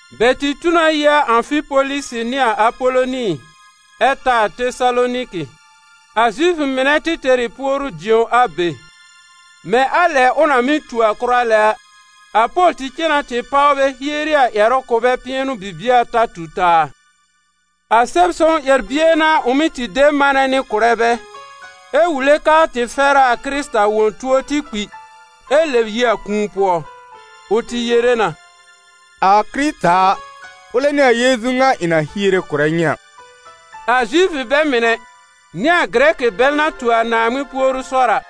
Bɛ tɩ tu na yi a Ãfipolisi nɩ a Apoloni ɛ ta a Tesaloniki. A Zifʋ mɩnɛ tɩ tɛr ɩ puoru-dĩo a be. Mɛ̃ a lɛ ʋ na mɩ́ tu a kʋra lɛ a, a Pol tɩ cen na tɩ páw bɛ hieri a ƴɛrʋ kʋ̀ bɛ pɩɛnʋ bibie ata tu taa. A Sɛb-sõw ƴɛr-bie n'a ʋ mɩ́ tɩ de manɛ nɩ kʋ̀rɛ bɛ, ɛ wule kɛ a tɩ fɛr a a Kɩrɩta wõ tuo tɩ kpi, ɛ lɛb yi a kũu pʋɔ. Ʋ tɩ yere na: «A Kɩrɩta a, ʋlɛ n'ɩ a Yeezu ŋa ɩ̃ na hiere kʋ̀rɛ nyɩ a.» A Zifʋ bɛ mɩnɛ nɩ a Gɩrɛkɩ bɛl na tu a Naaŋmɩn puoru sɔr a,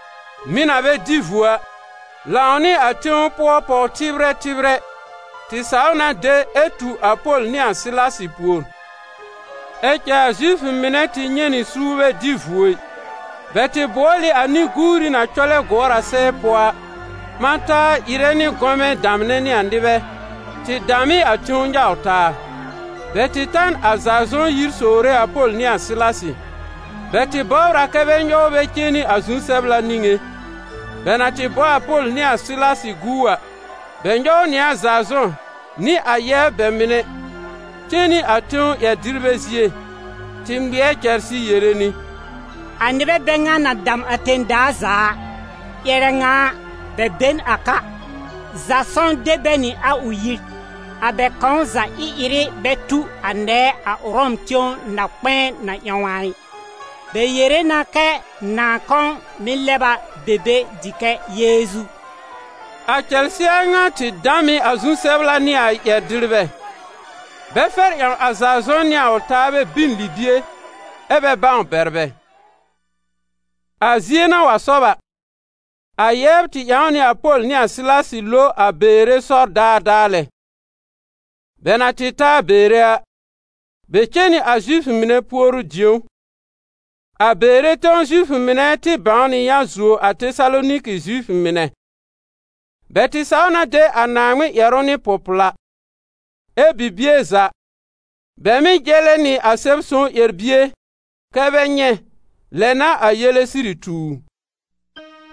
mɩ̀ na bɛ dɩ vuo a, lãw nɩ a tẽw pʋɔ pɔw-tɩbrɛ tɩbrɛ, tɩ saw na de ɛ tu a Pol nɩ a Sɩlasɩ pùor. Ɛ cɛ a Zifʋ mɩnɛ tɩ nyɛ̃ nɩ suur bɛ dɩ vuo ɩ. Bɛ tɩ bʋɔl ɩ a nɩ-guuri na cɔlɛ gʋɔr a sɛɛ pʋɔ a, ɓã taa ɩrɛ nɩ gɔmɛ damnɛ nɩ a nɩbɛ, tɩ dam ɩ a tẽw nyaw taa. Bɛ tɩ ta n a Zazɔ̃ yir sowre a Pol nɩ a Sɩlasɩ. Bɛ tɩ bɔbr a kɛ bɛ nyɔw bɛ cen nɩ a zu-sɛbla niŋé. Bɛ na tɩ bɔ a Pol nɩ a Sɩlasɩ gu a, bɛ nyɔw nɩ a Zazɔ̃ nɩ a yɛbr bɛ mɩnɛ cen nɩ a tẽw ƴɛr-dɩrbɛ zie, tɩ ŋmɩɛr cɛlsɩ yere nɩ: «A nɩbɛ bɛ ŋa na dam a tẽ-daa za a, ƴɛrɛ ŋa a, bɛ be n a ka. Zasɔ̃ de bɛ nɩ a ʋ yir. A bɛ kãw za ɩ-ɩrɩ bɛ tu a nɛɛ a Ʋrɔm tẽw na-kpɛ̃ɛ na ƴãw a ɩ. Bɛ yere na kɛ nãà kãw mɩ̀ lɛb a be be dɩ kɛ Yeezu.» A cɛlsɩ a ŋa tɩ dam ɩ a zu-sɛbla nɩ a ƴɛr-dɩrbɛ, bɛ fɛr ƴãw a Zasɔ̃ nɩ a ʋ taabɛ bin libie ɛ bɛ bãw bɛr bɛ. A zie na wa sɔb a, a yɛbr tɩ ƴãw nɩ a Pol nɩ a Sɩlasɩ lo a Beere sɔr daadaa lɛ. Bɛ na tɩ ta a Beere a, bɛ cen nɩ a Zifʋ mɩnɛ puoru-dĩ̀ó. A Beere tẽw Zifʋ mɩnɛ tɩ bãw nɩ yã zuo a Tesaloniki Zifʋ mɩnɛ. Bɛ tɩ saw na de a Naaŋmɩn ƴɛrʋ nɩ pʋ-pla, ɛ́ bibie za bɛ mɩ́ jɛlɛ nɩ a Sɛb-sõw ƴɛr-bie kɛ́ bɛ nyɛ̃, lɛ n'a a yele sɩrɩ tu u.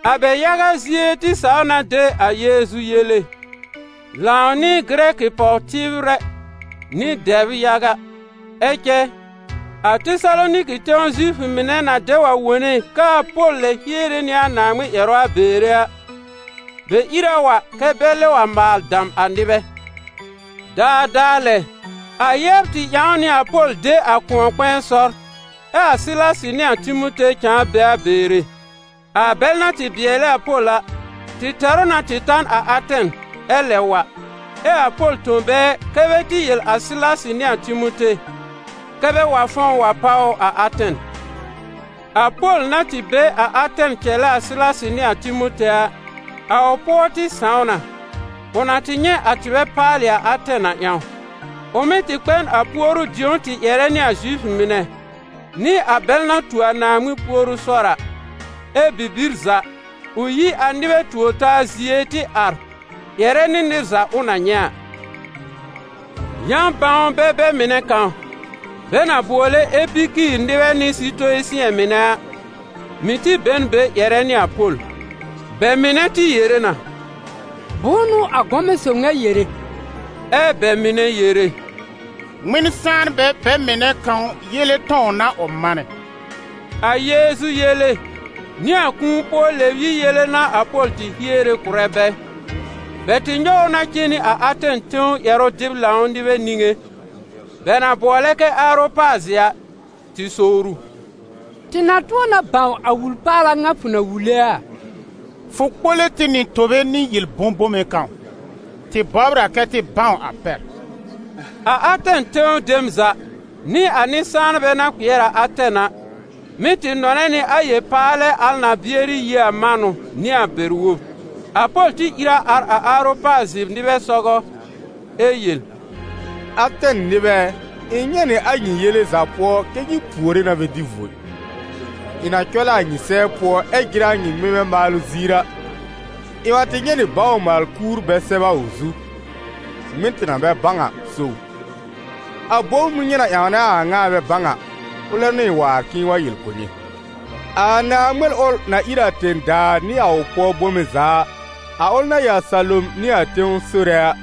A bɛ yaga zie tɩ saw na de a Yeezu yele, lãw nɩ Gɩrɛkɩ pɔw-tɩbrɛ nɩ dɛbr yaga. Ɛ cɛ, a Tesaloniki tẽw Zifʋ mɩnɛ na dɛ wa wone kɛ a Pol lɛ hiere nɩ a Naaŋmɩn ƴɛrʋ a Beere a, bɛ ìr a wa kɛ́ bɛ lɛb wa maal dam a nɩbɛ. Daadaa lɛ, a yɛbr tɩ ƴãw nɩ a Pol de a kʋ̃ɔ-kpɛ̃ɛ sɔr, ɛ a Sɩlasɩ nɩ a Timote cãa be a Beere. A bɛl na tɩ bɩɛlɛ a Pol a, tɩ tɛr ʋ na tɩ ta n a Atɛn ɛ lɛb wa, ɛ a Pol tõ bɛ kɛ́ bɛ tɩ yel a Sɩlasɩ nɩ a Timote, kɛ́ bɛ wa fɔ̃w wa páw ʋ a Atɛn. A Pol na tɩ be a Atɛn cɛlɛ a Sɩlasɩ nɩ a Timote a, a ʋ pʋɔ tɩ sãw na ʋ na tɩ nyɛ̃ a tɩbɛ paalɩ a Atɛn a ƴãw. Ʋ mɩ́ tɩ kpɛ n a puoru-dĩ̀ó tɩ ƴɛrɛ nɩ a Zifʋ mɩnɛ, nɩ a bɛl na tu a Naaŋmɩn puoru sɔr a. Ɛ́ bibir za, ʋ yi a nɩbɛ tuor-taa zie tɩ ar ƴɛrɛ nɩ nɩr za ʋ na nyɛ̃ a. Yã-bãwnbɛ bɛ mɩnɛ kãw, bɛ na bʋɔlɛ Epikiir nɩbɛ nɩ Sitoyisɩ̃ɛ mɩnɛ a, mɩ̀ tɩ be n be ƴɛrɛ nɩ a Pol. Bɛ mɩnɛ tɩ yere na: «Bʋ̃ʋ n'ʋ a gɔmɛ sob ŋa yere?» Ɛ bɛ mɩnɛ yere: «Ŋmɩn-sãanbɛ bɛ mɩnɛ kãw yele tɔ̃w n'a ʋ manɛ.» A Yeezu yele nɩ a kũu-pʋɔ-lɛ-yib yele n'a a Pol tɩ hiere kʋ̀rɛ bɛ. Bɛ tɩ nyɔw ʋ na cen nɩ a Atɛn tẽw ƴɛrʋ-dɩb-lãw nɩbɛ niŋé, bɛ na bʋɔlɛ kɛ Aropazɩ a, tɩ sowr ʋ: «Tɩ na tʋ̃ɔ na bãw a wul-paala ŋa fʋ na wule a? Fʋ kpole tɩ nɩ tobe nɩ yel-bõ-bome kãw, tɩ bɔbr a kɛ tɩ bãw a pɛr.» A Atɛn tẽw dem za, nɩ a nɩ-sãanbɛ na kpɩɛr a Atɛn a, mɩ́ tɩ nɔnɛ nɩ a yel-paalɛ al na bɩɛrɩ yi a manʋ nɩ a bɛr-wob. A Pol tɩ ìr a ar a Aropazɩ nɩbɛ sɔgɔ ɛ yel: «Atɛn nɩbɛ ɛ, ɩ̃ nyɛ̃ nɩ a nyɩ yele za pʋɔ kɛ́ nyɩ puore na bɛ dɩ vuo ɩ. Ɩ̃ na cɔlɛ a nyɩ sɛɛ pʋɔ ɛ jɩrɛ a nyɩ ŋmɩmɛ maalʋ ziir a, ɩ̃ wa tɩ nyɛ̃ nɩ bawr-maal-kuur bɛ sɛb a ʋ zu: ‹Ŋmɩn tɩ na bɛ bãw a so ʋ.› A bom ʋl nyɩ na ƴãwnɛ a a ŋa ɛ bɛ bãw a, ʋlɛ n'ʋ ɩ̃ waar k'ɩ̃ɩ wa yel kʋ̀ nyɩ. A Naaŋmɩn ʋl na ír a tẽ-daa nɩ a ʋ pʋɔ bome za a, a ʋl na ɩ a salom nɩ a tẽw Sore a,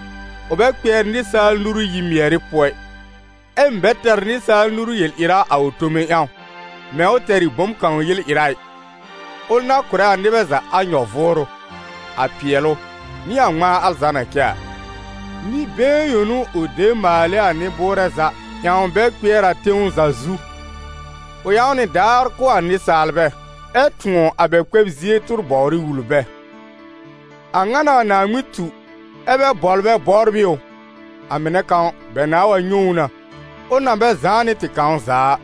ʋ bɛ kpɩɛr nɩsaal nuru yi-mɩɛrɩ pʋɔ ɩ, ɛ mɩ̀ bɛ tɛr nɩsaal nuru yel-ɩra a ʋ tome ƴãw, mɛ̃ ʋ tɛr ɩ bom kãw yel-ɩra a ɩ, ʋl na kʋ̀rɛ a nɩbɛ za a nyɔ-vʋʋrʋ, a pɩɛlʋ nɩ a ŋmãa al za na cɛ a. Nɩ-been yõ n'ʋ ʋ de maal ɩ a nɩ-bʋʋrɛ za ƴãw bɛ kpɩɛr a tẽw za zu. Ʋ ƴãw nɩ daar kʋ̀ a nɩsaalbɛ, ɛ tʋ̃ɔ̀ a bɛ kpɛb zie tʋr-bɔwrɩ wul bɛ. A ŋa n'a a Naaŋmɩn tu, ɛ́ bɛ bɔblɛ bɔbr ɩ ʋ, a mɩnɛ kãw bɛ nãa wa nyɛ̃ ʋ na, ʋl na bɛ zãá nɩ tɩ kãw za a.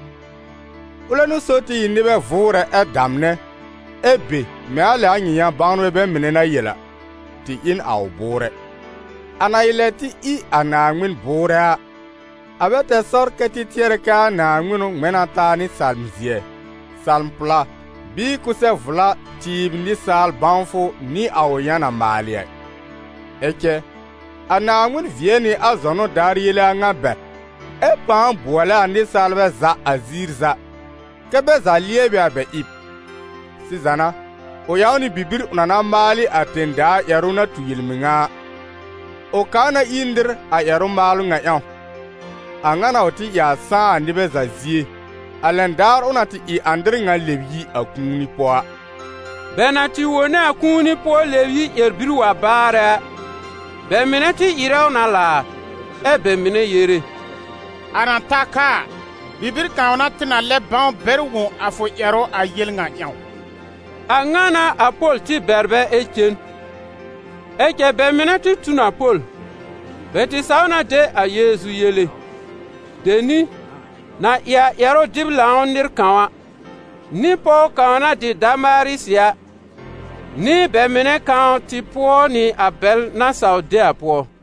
Ʋlɛ n'ʋ so tɩ ɩ nɩbɛ vʋʋrɛ ɛ damnɛ, ɛ be mɛ̃ a lɛ a nyɩ yã-bãwnbɛ bɛ mɩnɛ na yel a: ‹Tɩ ɩ n a ʋ bʋʋrɛ.› A na ɩ lɛ tɩ ɩ a Naaŋmɩn bʋʋrɛ a, a bɛ tɛr sɔr kɛ́ tɩ tɩɛrɛ kɛ a naaŋmɩnʋ ŋmɛ̃ na taa nɩ salm-zɩɛ, salm-pla bɩɩ kʋsɛ-vla tɩɩb nɩsaal bãwfʋ nɩ a ʋ yã na maalɩ a ɩ. Ɛ cɛ a Naaŋmɩn vɩɛ nɩ a zɔnʋ daar yele a ŋa bɛr, ɛ pãa bʋɔlɛ a nɩsaalbɛ za a ziir za, kɛ́ bɛ za lɩɛbɩ a bɛ ɩb. Sɩza n'a, ʋ ƴãw nɩ bibir ʋ na na maal ɩ a tẽ-daa ƴɛrʋ na tu yel-mɩŋa a. Ʋ kaa na ir nɩr a ƴɛrʋ-maalʋ ŋa ƴãw. A ŋa n'a ʋ tɩ ɩ a sãá a nɩbɛ za zie, a lɛn daar ʋ na tɩ ɩ a nɩr ŋa lɛb yi a kũuni pʋɔ a.» Bɛ na tɩ wone a kũuni-pʋɔ- lɛ-yib ƴɛr-bir wa baarɛ a, bɛ mɩnɛ tɩ ɩrɛ ʋ na laar, ɛ bɛ mɩnɛ yere: «A na ta ka a, bibir kãw n'a tɩ na lɛb bãw bɛr wõ a fʋ ƴɛrʋ a yel ŋa ƴãw.» A ŋa n'a a Pol tɩ bɛr bɛ ɛ cen. Ɛ cɛ bɛ mɩnɛ tɩ tu n a Pol, bɛ tɩ saw na de a Yeezu yele. Deni, na ɩ a ƴɛrʋ-dɩb lãw nɩr kãw a, nɩ pɔw kãw na dɩ Damarisɩ a, nɩ bɛ mɩnɛ kãw tɩ pʋɔ nɩ a bɛl na saw de a pʋɔ.